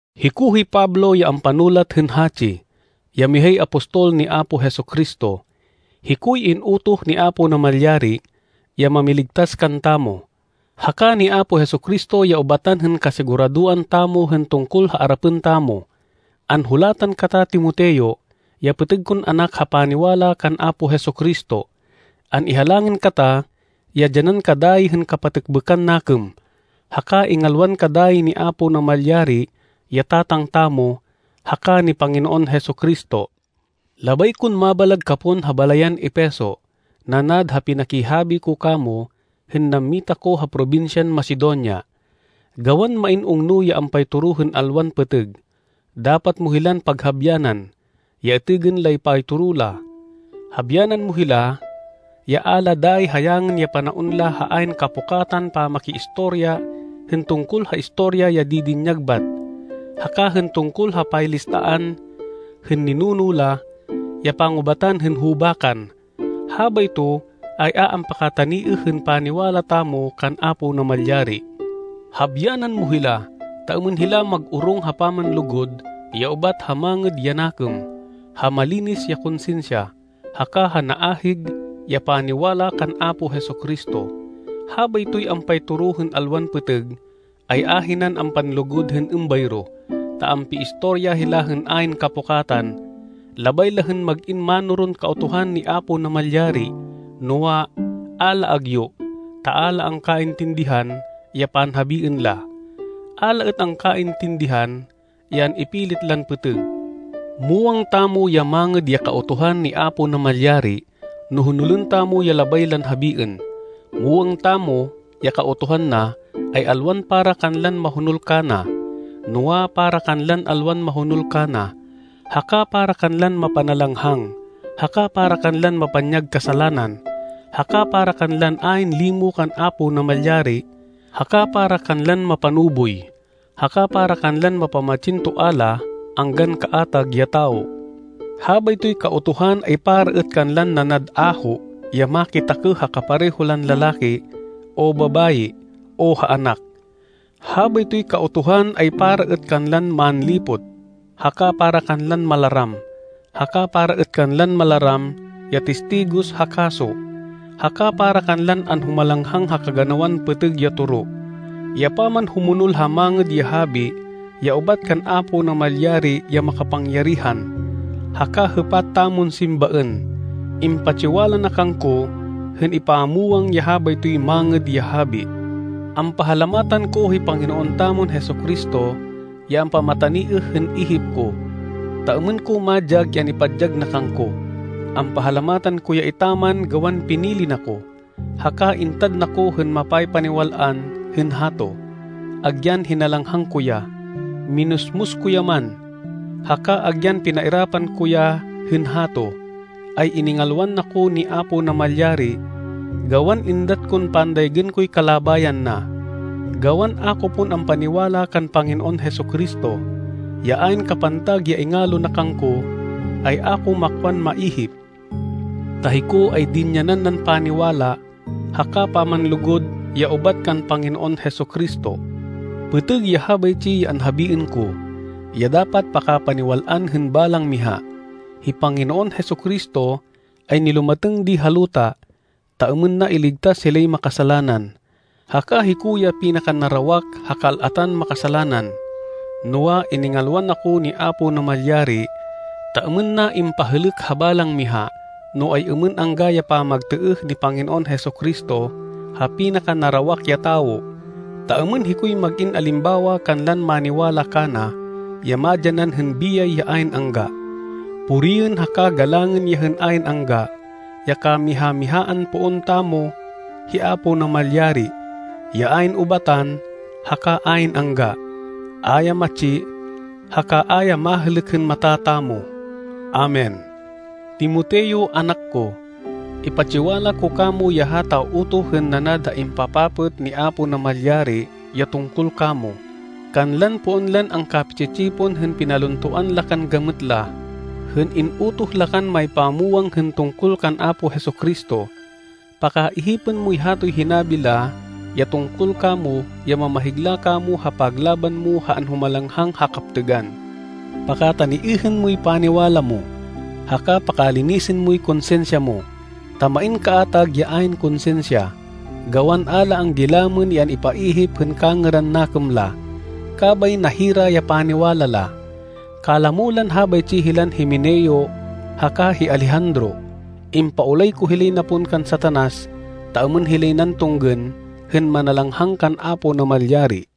Hiko hi Pablo ya ampanulat hên hatsi, ya mihay apostol ni Apo Jesu-Cristo. Hikoy in-utoh ni Apo Namalyari, ya mamiligtas kantamo, haka ni Apo Jesu-Cristo ya ubatan hên kasiguradoan tamo hên tungkol ha arapên tamo. Anhulatan kata Timoteo, ya pêtêg kon anak ha paniwala kan Apo Jesu-Cristo. An-ihalangin kata ya dyanan ka dayi hên kapatêkbêkan nakêm, haka ingalwan ka dayi ni Apo Namalyari ya Tatang tamo, haka ni Panginoon Jesu-Cristo. Labay kon mabalag ka pon ha balayan Efeso, nanad ha pinakihabi ko kamo hên nammita ko ha probinsyan Macedonia, gawan main ungno ya ampaytoro hên alwan pêtêg. Dapat mo hilan paghabyanan, ya itêgên lay paytoro la. Habyanan mo hila ya a la dayi hayangên ya panaon la ha ayn kapukatan pamakiistorya hên tungkol ha istorya ya didinyag bat, haka hên tungkol ha paylistaan hên ninuno la ya pangubatan hên hubakan. Habayto, ay a ampakataniêh hên paniwala tamo kan Apo Namalyari. Habyanan mo hila, ta êmên hila mag-orong ha pamanlugud ya ubat ha mangêd ya nakêm, ha malinis ya konsinsya, haka ha naahig ya paniwala kan Apo Jesu-Cristo. Habaytoy ampaytoro hên alwan pêtêg, ay ahinan ampanlugud hên êmbayro, ta ampiistorya hila hên ayn kapukatan. Labay la hên mag-in mánoron Kautuhan ni Apo Namalyari, noa, a la agyu, ta a la angkaintindihan ya panhabiên la. A la êt angkaintindihan ya an-ipilit lan pêtêg. Muwang tamo ya mangêd ya Kautuhan ni Apo Namalyari no honolên tamo ya labay lan habiên. Muwang tamo ya Kautuhan na, ay alwan para kanlan mahonol kana, noa, para kanlan alwan mahonol kana, haka para kanlan mapanalanghang, haka para kanlan mapanyag kasalanan, haka para kanlan ayn limo kan Apo Namalyari, haka para kanlan mapanuboy, haka para kanlan mapamatsin toa la anggan kaatag ya tawo. Habaytoy Kautuhan ay para êt kanlan nanad aho ya makitakêh ha kapareho lan lalaki o babayi o ha anak. Habaytoy Kautuhan ay para êt kanlan manlipot, haka para kanlan malaram, haka para êt kanlan malaram ya tistigos ha kaso, haka para kanlan anhumalanghang ha kaganawan pêtêg ya toro, ya pamanhumonol ha Mangêd ya Habi ya ubat kan Apo Namalyari ya makapangyarihan, haka hêpat tamon simbaên. Impatsiwala na kangko hên ipamwang ya habaytoy Mangêd ya Habi. Ampahalamatan ko hi Panginoon tamon Jesu-Cristo ya ampamataniêh hên ihip ko, ta êmên ko madyag ya an-ipadyag na kangko. Ampahalamatan ko ya etaman gawan pinili na ko, haka intad na ko hên mapaypaniwal-an hên hato. Agyan hinalanghang ko ya, minusmus ko ya man, haka agyan pinairapan ko ya hên hato, ay iningalwan na ko ni Apo Namalyari gawan êndat kon pandaygên koy kalabayan na, gawan a ko pon ampaniwala kan Panginoon Jesu-Cristo. Ya ayn kapantag ya ingalo na kangko, ay a ko makwan maihip, ta hiko, ay dinyanan nan paniwala, haka pamanlugud ya ubat kan Panginoon Jesu-Cristo. Pêtêg ya habaytsi ya anhabiên ko, ya dapat pakapaniwal-an hên balang miha. Hi Panginoon Jesu-Cristo, ay nilumatêng di ha luta, ta êmên na iligtas hilay makasalanan, haka hiko ya pinakanarawak ha kal-atan makasalanan. Noa, iningalwan ako ni Apo Namalyari, ta êmên na impahêlêk ha balang miha no ay-êmên angga ya pamagtêêh ni Panginoon Jesu-Cristo ha pinakanarawak ya tawo, ta êmên hikoy mag-in alimbawa kanlan maniwala kana, ya madyanan hên biyay ya ayn angga. Puriên haka galangên ya hên ayn angga, ya kamiha-mihaan poon tamo hi Apo Namalyari, ya ayn ubatan haka ayn angga. A ya matsi haka a ya mahêlêk hên mata tamo. Amen. Timoteo, anak ko, ipatsiwala ko kamo ya hata utoh hên nanad ha impapapêt ni Apo Namalyari ya tungkol kamo, kanlan poon lan angkapi-tsi-tsipon hên pinaluntoan la kan gamêt la, hên in-utoh la kan maypamwang hên tungkol kan Apo Jesu-Cristo. Pakaihipên moy hatoy hinabi la ya tungkol kamo ya mamahigla kamo ha paglaban mo ha anhumalanghang ha kaptêgan. Pakataniêhên moy paniwala mo, haka pakalinisên moy konsinsya mo, ta main kaatag ya ayn konsinsya, gawan a la anggilamên ya an-ipaihip hên kangêran nakêm la, kabay nahira ya paniwala la. Kalamo lan habaytsi hilan Himeneo haka hi Alejandro. Impaulay ko hilay na pon kan Satanas ta êmên hilay nan tunggên hên manalanghang kan Apo Namalyari.